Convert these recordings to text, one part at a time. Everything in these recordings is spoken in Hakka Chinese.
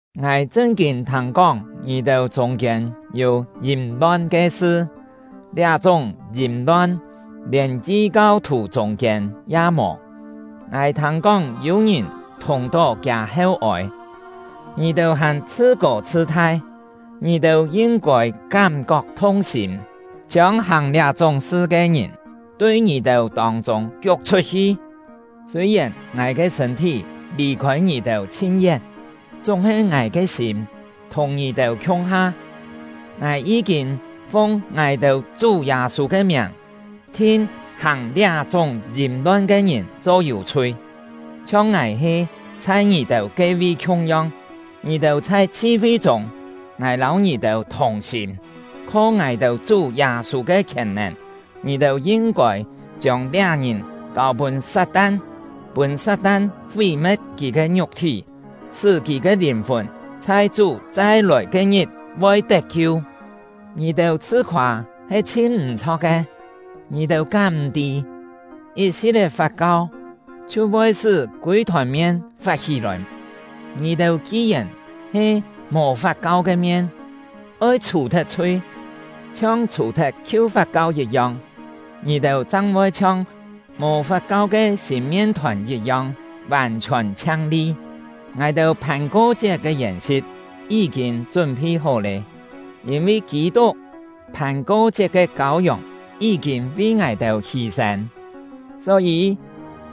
Ngài chṳn-kîn thâng-kóng ngì-têu chûng-kiên yû yìm-lon ke sṳ; liá-chúng yìm-lon lièn yi-kau-thù chûng-kiên ya mò. Ngài thâng-kóng yû-ngìn thùng-tó kiâ heu-ôi! Ngì-têu hàn chhṳ-kô chhṳ-thai! Ngì-têu yin-kôi kám-kok thung-sîm, chiông hàng liá-chúng sṳ ke ngìn tui ngì-têu tông-chûng kiuk chhut-hi! Sûi-yèn ngài ke sṳ̂n-thí lì-khôi ngì-têu chhin yén, chúng-he ngài ke sîm thùng ngì-têu khiung-ha. Ngài yí-kîn fung ngài-têu Chú Yâ-sû ke miàng thin hàng liá-chúng yìm-lon ke ngìn cho yû-chhui, chhiong ngài he chhai ngì-têu ke-vi khiung-yong. Ngì-têu chhai chhi-fi-chûng, ngài lâu ngì-têu thùng-sîm. Kho ngài-têu Chú Yâ-sû ke khièn-nèn, ngì-têu yin-kôi chiông liá ngìn kâu-pûn Sat-tan, pûn Sat-tan fí-me̍t kì ke ngiuk-thí, sṳ́ kì ke lìn-fùn chhai Chú chai-lòi ke-ngit voi tet-kiu. Ngì-têu chhṳ-khoâ he chhin m̀-chho̍k ke! Ngì-têu kám m̀-tî, yit-si̍t-é fat-kau chhiu voi sṳ́ kûi-thòn mien fat-hí-lòi? Ngì-têu ki-yèn he mò fat-kau ke mien, oi chhù-thet chhui, chhiong chhù-thet khiu fat-kau yit-yong; ngì-têu chang voi chhiong mò fat-kau ke sîn mien-thòn yit-yong, vàn-chhiòn chhiang-li. Ngài-têu Phàn-ko-chiet ke yèn-si̍t yí-kîn chún-phi hó lé, yîn-vi Kî-tuk — Phàn-ko-chiet ke Kâu-yòng yí-kîn vi ngài-têu hî-sên. Só-yî,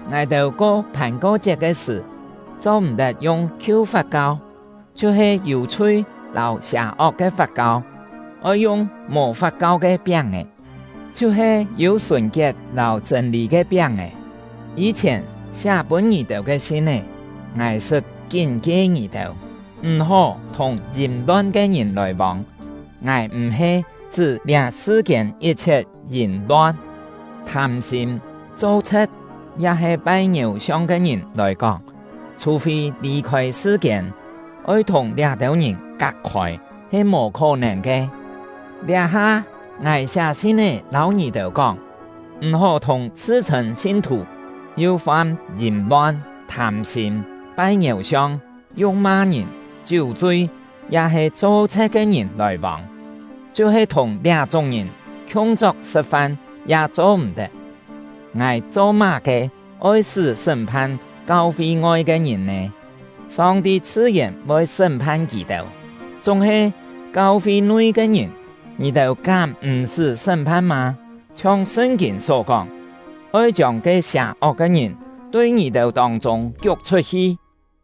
ngài-têu ko Phàn-ko-chiet ke sṳ̀, cho-m̀-tet yung khiu fat-kau, chhiu-he yû chhui lâu sià-ok ke fat-kau; oi yung mò fat-kau ke piáng-è, chhiu-he yû sùn-kiet lâu chṳ̂n-lî ke piáng-è. Yî-chhièn siá pûn ngì-têu ke sin-é, ngài sṳt kín-kie ngì-têu, m̀-hó thùng yìm-lon ke ngìn lòi-vông. Ngài m̀-he chṳ́ liá sṳ-kiên yit-chhiet yìm-lon, thâm-sîm, cho-chhe̍t, ya-he pai ngiéu-siong ke ngìn lòi kóng; chhù-fî lì-khôi sṳ-kiên, oi thùng liá-têu ngìn kak-khôi he mò khó-nèn ke. Liá-ha, ngài siá sin-é lâu ngì-têu kóng: M̀-hó thùng chhṳ-chhṳ̂n sin-thù yu fam yìm-lon, thâm-sîm, pai ngiéu-siong, yu̍k-ma ngìn, chiú-chui, ya-he cho-chhe̍t ke ngìn lòi-vông; chhiu-he thùng liá-chúng ngìn khiung-chok sṳ̍t-fan ya cho-m̀-tet. Ngài cho-má-ke oi-sṳ́ sṳ́m-phan kau-fi ngoi ke ngìn nè? Song-ti chhṳ-yèn voi sṳ́m-phan kì-têu. Chúng-he, kau-fi nui ke ngìn ngì-têu kám m̀-sṳ́ sṳ́m-phan mâ? Chhiong Sṳn-kîn só kóng: “Oi chiông ke sià-ok ke ngìn tui ngì-têu tông-chûng kiuk chhut-hi!”